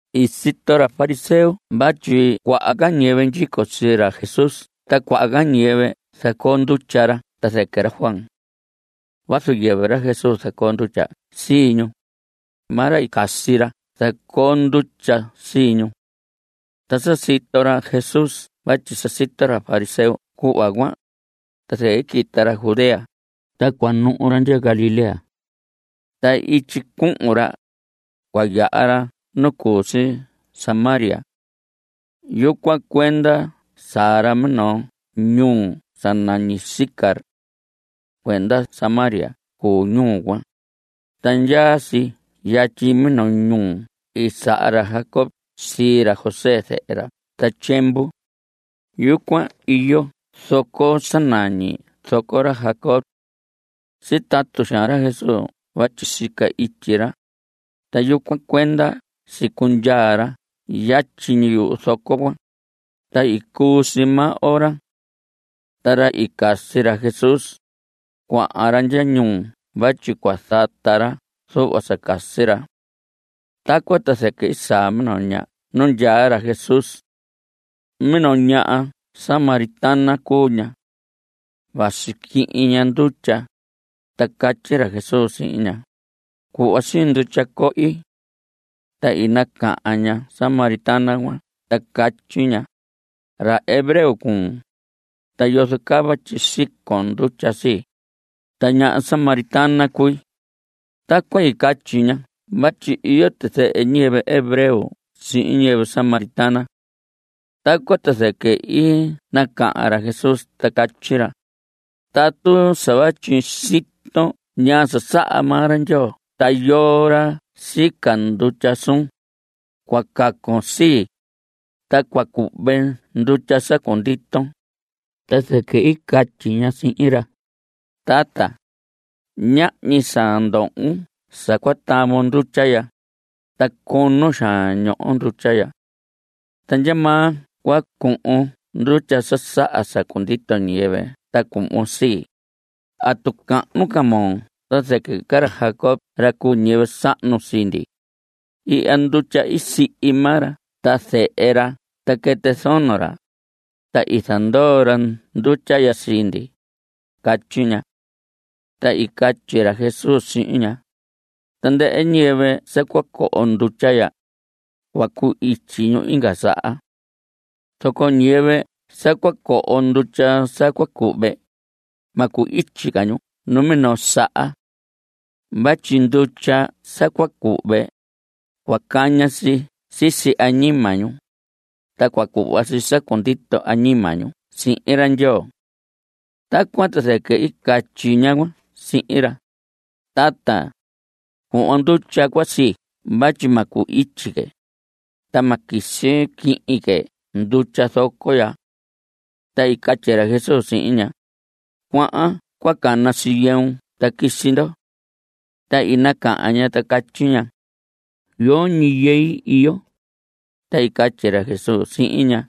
I sito ra fariseo vatyi cuaha ca ñiyɨvɨ ndyico sii ra Jesús ta cuaha ca ñiyɨvɨ zacoo ndutya ra ta zɨquɨ ra Juan. Vazu yɨvɨ ra Jesús zacoo ndutya sii ñu. Maa ra i casi ra zacoo ndutya sii ñu. Ta sa sito ra Jesús vatyi sa sito ra fariseo cuhva cuan, ta zɨquɨ i quita ra Judea ta cua nuhu ra ndya Galilea. Ta ityi cuhun ra, cua yaha ra nu cu si Samaria. Yucuan cuenda saa ra minoo ñuu sa nañi Sicar. Cuenda Samaria cuu ñuu cuan, ta ndyaa si yatyi minoo ñuhu i saha ra Jacob sii ra José zehe ra ta tyiemvu. Yucuan iyo zoco sa nañi zoco ra Jacob. Sitatu xaan ra Jesús vatyi sica ityi ra, ta yucuan cuenda sicundyaa ra yatyi ñi yuhu zoco cuan. Ta i cuu si maa ora. Ta ra i casi ra Jesús, cuahan ra ndya ñuu vatyi cua zata ra zuhva sa casi ra. Tacuan ta zɨquɨ i saa minoo ñaha nu ndyaa ra Jesús. Minoo ñaha samaritana cuu ña. Vasi quihin ña ndutya. Ta catyi ra Jesús sihin ña: Cuhva siin ndutya cohi. Ta i nacahan ñaha samaritana cuan ta catyi ña: Ra hebreo cuun, ta yozo caa vatyi sicon ndutya sii, ta ñaha samaritana cui. Tacuan i catyi ña vatyi iyo tizɨhɨ ñiyɨvɨ hebreo sihin ñiyɨvɨ samaritana. Tacuan ta zɨquɨ i nacahan ra Jesús ta catyi ra: Tatu sa vatyi siton ñaa sa saha maa ra Ndyoo ta yoo ra sica ndutya suun, cua cacon sii, ta cua cuhve ndutya sa cunditon. Ta zɨquɨ i catyi ña sihin ra: Tata, ñahñi sa ndohon sa cua tavon ndutya ya, ta cono xaan ñoho ndutya ya. ¿Ta ndyamaa cua cuhun ndutya sa saha sa cundito ñiyɨvɨ ta cuhvon sii? ¿Atu cahnu ca moo ta zɨquɨ ra Jacob ra cu ñiyɨvɨ sahnu sii ndi? Ihya ndutya i sihi maa ra ta zehe ra ta quɨtɨ zono ra, ta i zandoo ra ndutya ya sii ndi. Catyi ña. Ta i catyi ra Jesús sihin ña: Tandɨhɨ ñiyɨvɨ sa cua coho ndutya ya, cua cu‑ityi ñu inga saha. Zoco ñiyɨvɨ sa cua coho ndutya sa cua cuhve, ma cu‑ityi ca ñu numinoo saha. Vatyi ndutya sa cua cuhve, cua caña si sisi añima ñu, ta cua cuhva si sa cundito añima ñu sihin ra Ndyoo. Tacuan ta zɨquɨ i catyi ñaha cuan sihin ra: Tata, cuhvon ndutya cuan sii vatyi ma cu‑ityi que, ta ma quisi quihin que ndutya zoco ya. Ta i catyi ra Jesús sihin ña: Cuahan cua canon sii yɨun ta quisi ndo. Ta i nacahan ña ta catyi ña: Yoñi yɨi iyo. Ta i catyi ra Jesús sihin ña: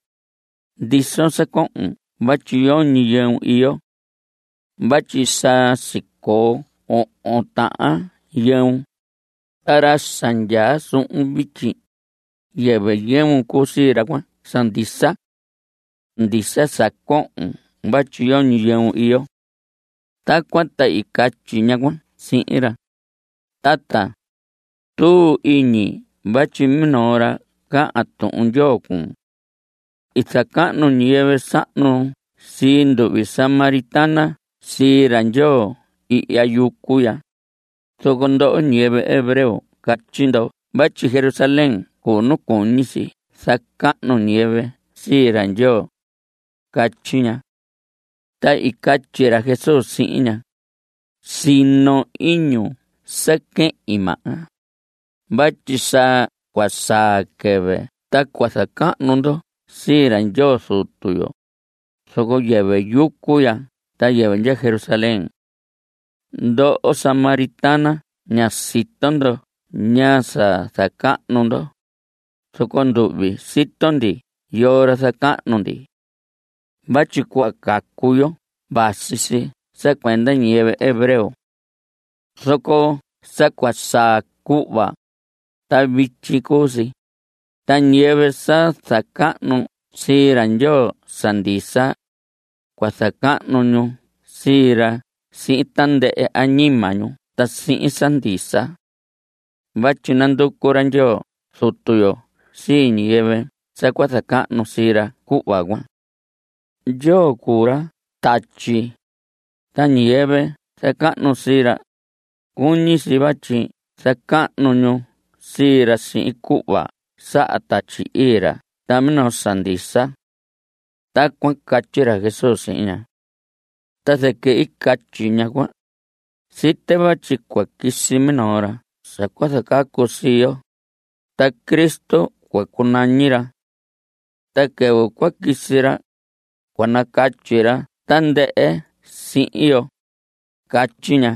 Ndison sa cohon vatyi yoñi yɨun iyo. Vatyi sa sicoo ohon tahan yɨun. Ta ra sa ndyaa suhun vityi, yɨvɨ yɨun cuu sii ra cuan sa ndisa. Ndisa sa cohon vatyi yoñi yɨun iyo. Tacuan ta i catyi ñaha cuan sihin ra: Tata, tuu iñi vatyi minoo ra cahan Tuhun Ndyoo cuun. I zacahnu ñiyɨvɨ sahnu sii nduhvi samaritana sii ra Ndyoo ihya yucu ya, zoco ndoho ñiyɨvɨ hebreo catyi ndo vatyi Jerusalén cuu nu cuñi si zacahnu ñiyɨvɨ sii ra Ndyoo, catyi ña. Ta i catyi ra Jesús sihin ña: Sino iñun sa quehin, maha, vatyi sa cua saa quɨvɨ ta cua zacahnu ndo sii ra Ndyoo Zutu yo, zoco yɨvɨ yucu ya ta yɨvɨ ndya Jerusalén. Ndoho samaritana ña sito ndo ñaa sa zacahnu ndo, zoco nduhvi sito ndi yoo ra zacahnu ndi. Vatyi cuhva cacu yo vasi si sa cuenda ñiyɨvɨ hebreo. Zoco sa cua saa cuhva, ta vityi cuu si, ta ñiyɨvɨ sa zacahnu sii ra Ndyoo sa ndisa, cua zacahnu ñu sii ra sihin tandɨhɨ añima ñu ta sihin sa ndisa. Vatyi nanducu ra Ndyoo Zutu yo sii ñiyɨvɨ sa cua zacahnu sii ra cuhva cuan. Ndyoo cuu ra tatyi, ta ñiyɨvɨ zacahnu sii ra, cuñi si vatyi zacahnu ñu sii ra sihin cuhva saha Tatyi Ii ra ta minoo sa ndisa. Tacuan catyi ra Jesús sihin ña. Ta zɨquɨ i catyi ñaha cuan: Site vatyi cua quisi minoo ra sa cua zacacu sii yo, ta Cristo cua cunañi ra. Ta quɨvɨ cua quisi ra, cua nacatyi ra tandɨhɨ sihin yo, catyi ña.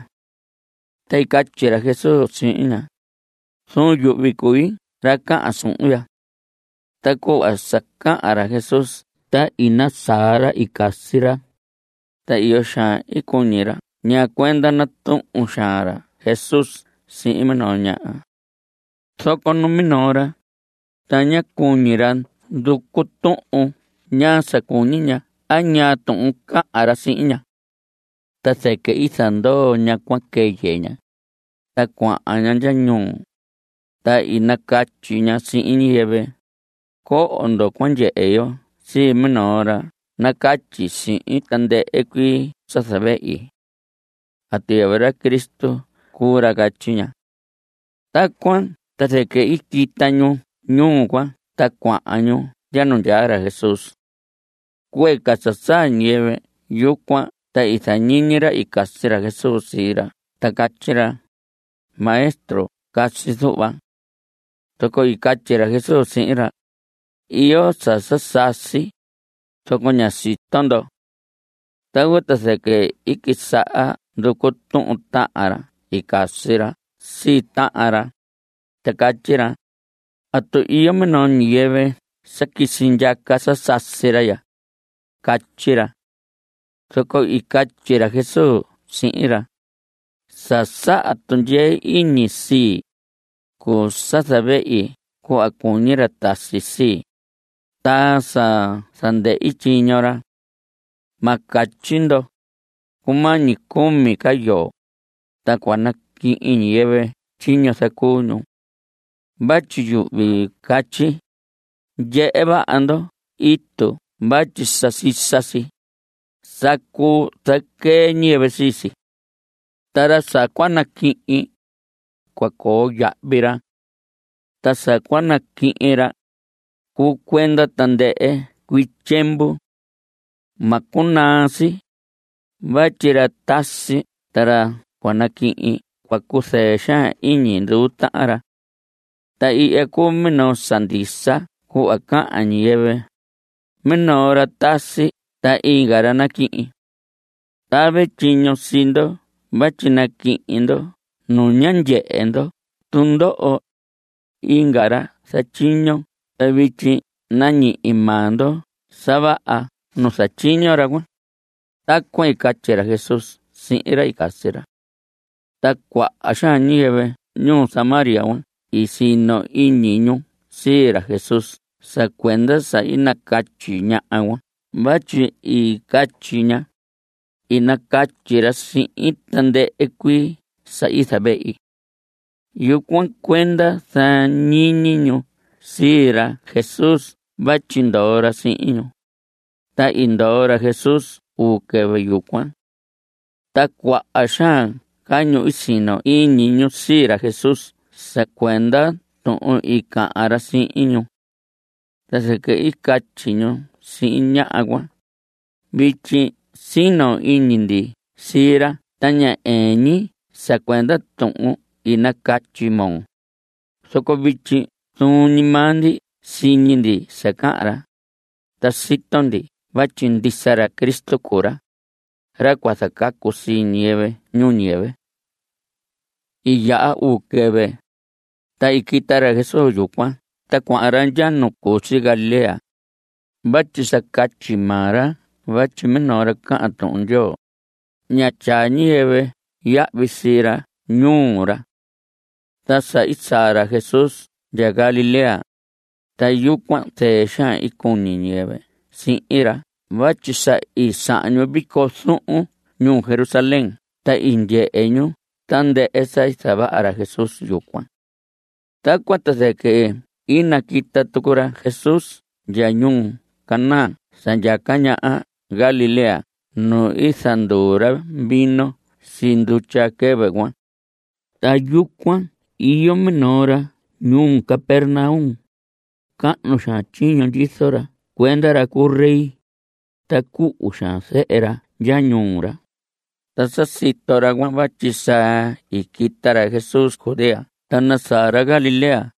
Ta i catyi ra Jesús sihin ña: Zuun yuhvi cui ra cahan suhun ya. Ta cuhva sa cahan ra Jesús ta i nasaa ra i casi ra, ta iyo xaan i cuñi ra ñaa cuenda natuhun xaan ra Jesús sihin minoo ñaha. Zoco numinoo ra, ta ñá cuñi ra nducu tuhun ñaa sa cuñi ña a ñaa tuhun cahan ra sihin ña. Ta zɨquɨ i zandoo ñaha cuan quɨyɨ ña, ta cuahan ña ndya ñuu, ta i nacatyi ña sihin ñiyɨvɨ: Coho ndo cua ndyehe yo sii minoo ra nacatyi sihin tandɨhɨ cuii sa zavehi. ¿Atu yɨvɨ ra Cristo cuu ra? Catyi ña. Tacuan ta zɨquɨ i quita ñu ñuu cuan ta cuahan ñu ndya nu ndyaa ra Jesús. Cuee ca sa saa ñiyɨvɨ yucuan ta i zañiñi ra i casi ra Jesús sii ra ta catyi ra: Maestro, casi zuhva. Zoco i catyi ra Jesús sihin ra: Iyo sa sa sasi, zoco ña sito ndo. Tacuan ta zɨquɨ i quisaha nducu tuhun tahan ra i casi ra sii tahan ra, ta catyi ra: ¿Atu iyo minoo ñiyɨvɨ sa quisi ndyaca sa sasi ra ya? Catyi ra. Zoco i catyi ra Jesús sihin ra: Sa saha tundyee iñi sii, cuu sa zavehi cuhva cuñi ra tasi sii, ta sa zandɨhi tyiño ra. Ma catyi ndo: “Cumañi cumi ca yoo, ta cua naquihin ñiyɨvɨ tyiño i zacuu ñu.” Vatyi yuhvi catyi: Ndyehe vaha ndo itu vatyi sa sisa si. Sa cuu zaquee ñiyɨvɨ sii si. Ta ra sa cua naquihin, cua coo yahvi ra. Ta sa cua naquihin ra, cuu cuenda tandɨhɨ cuii tyiemvu. Ma cunaa si. Vatyi ra tasi ta ra cua naquihin cua cuzɨɨ xaan iñi nduu tahan ra. Ta ihya cuu minoo sa ndisa cuhva cahan ñiyɨvɨ: “Minoo ra tasi ta inga ra naquihin.” Tave tyiño sii ndo vatyi naquihin ndo nu ñá ndyehe ndo tundoho. Inga ra zatyiño ta vityi nañihi maa ndo sa vaha nu zatyiño ra cuan. (Tacuan i catyi ra Jesús sihin ra i casi ra.) Ta cuaha xaan ñiyɨvɨ ñuu Samaria i sino iñi ñu sii ra Jesús sa cuenda sa i nacatyi ñaha cuan vatyi i catyi ña: “I nacatyi ra sihin tandɨhɨ cuii sa i zavehi.” Yucuan cuenda zañiñi ñu sii ra Jesús vatyi ndoo ra sihin ñu. Ta i ndoo ra Jesús uu quɨvɨ yucuan. Ta cuaha xaan ca ñu i sino iñi ñu sii ra Jesús sa cuenda tuhun i cahan ra sihin ñu. Ta zɨquɨ i catyi ñu sihin ñaha cuan: Vityi sino iñi ndi sii ra ta ña ɨɨn ñi sa cuenda tuhun i nacatyi moo, zoco vityi zuun ñi maa ndi siñi ndi sa cahan ra, ta sito ndi vatyi ndisa ra Cristo cuu ra, ra cua zacacu sii ñiyɨvɨ ñuu ñiyɨvɨ. I yaha uu quɨvɨ, ta i quita ra Jesús yucuan ta cuahan ra ndya nu cu si Galilea. Vatyi sa catyi maa ra vatyi minoo ra cahan Tuhun Ndyoo, ña tyaa ñiyɨvɨ yahvi sii ra ñuu ra. Ta sa i saa ra Jesús ndya Galilea, ta yucuan zɨɨ xaan i cuñi ñiyɨvɨ sihin ra vatyi sa i sahan ñu vico zuhun ñuu Jerusalén ta i ndyehe ñu tandɨhɨ sa i zavaha ra Jesús yucuan. Tacuan ta zɨquɨ i naquita tucu ra Jesús ndya ñuu Caná sa ndyaca ñaha Galilea nu i zanduu ra vino sii ndutya quɨvɨ cuan. Ta yucuan iyo minoo ra ñuu Capernaum. Cahnu xaan tyiño ndyizo ra cuenda ra cu rey. Ta cuhu xaan zehe ra ndya ñuu ra. Ta sa sito ra cuan vatyi sa i quita ra Jesús Judea ta nasaa ra Galilea,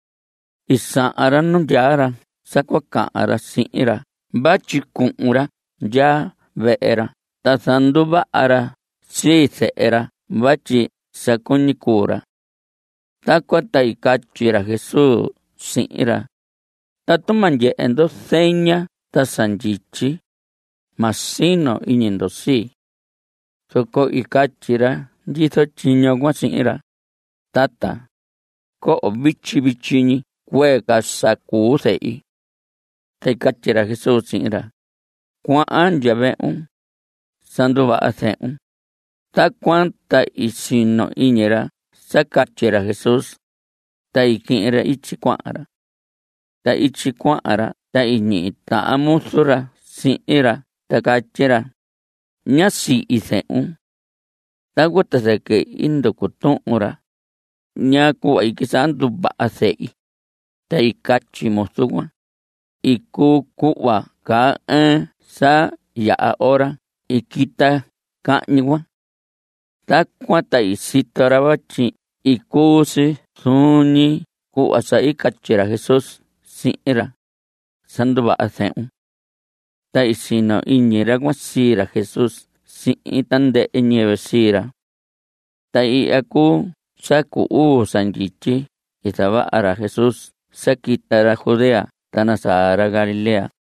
i sahan ra nu ndyaa ra sa cua cahan ra sihin ra vatyi cuhun ra ndya vehe ra ta zanduvaha ra sii zehe ra vatyi sa cuñi cuu ra. Tacuan ta i catyi ra Jesús sihin ra: Tatu ma ndyehe ndo zeña ta sa ndyityi, ma sino iñi ndo sii. Zoco i catyi ra ndyizo tyiño cuan sihin ra: Tata, coho vityi vityi ñi cuee ca sa cuu zehi. Ta i catyi ra Jesús sihin ra: Cuahan ndya vehun. Sa nduvaha zehun. Tacuan ta i sino iñi ra sa catyi ra Jesús, ta i quihin ra ityi cuahan ra. Ta ityi cuahan ra ta i ñihi tahan muzu ra sihin ra ta catyi ra: Ñá sihi zehun. Tacuan ta zɨquɨ i nducu tuhun ra: ¿Ñaa cuhva i quisaha nduvaha zehi? Ta i catyi muzu cuan: Icu, cuhva caa ɨɨn sa yaha ora i quita cahñi cuan. Tacuan ta i sito ra vatyi i cuu si zuun ñi cuhva sa i catyi ra Jesús sihin ra: “Sa nduvaha zehun.” Ta i sino iñi ra cuan sii ra Jesús sihin tandɨhɨ ñiyɨvɨ sii ra. Ta ihya cuu sa cu uu sa ndyityi i zavaha ra Jesús sa quita ra Judea ta nasaa ra Galilea.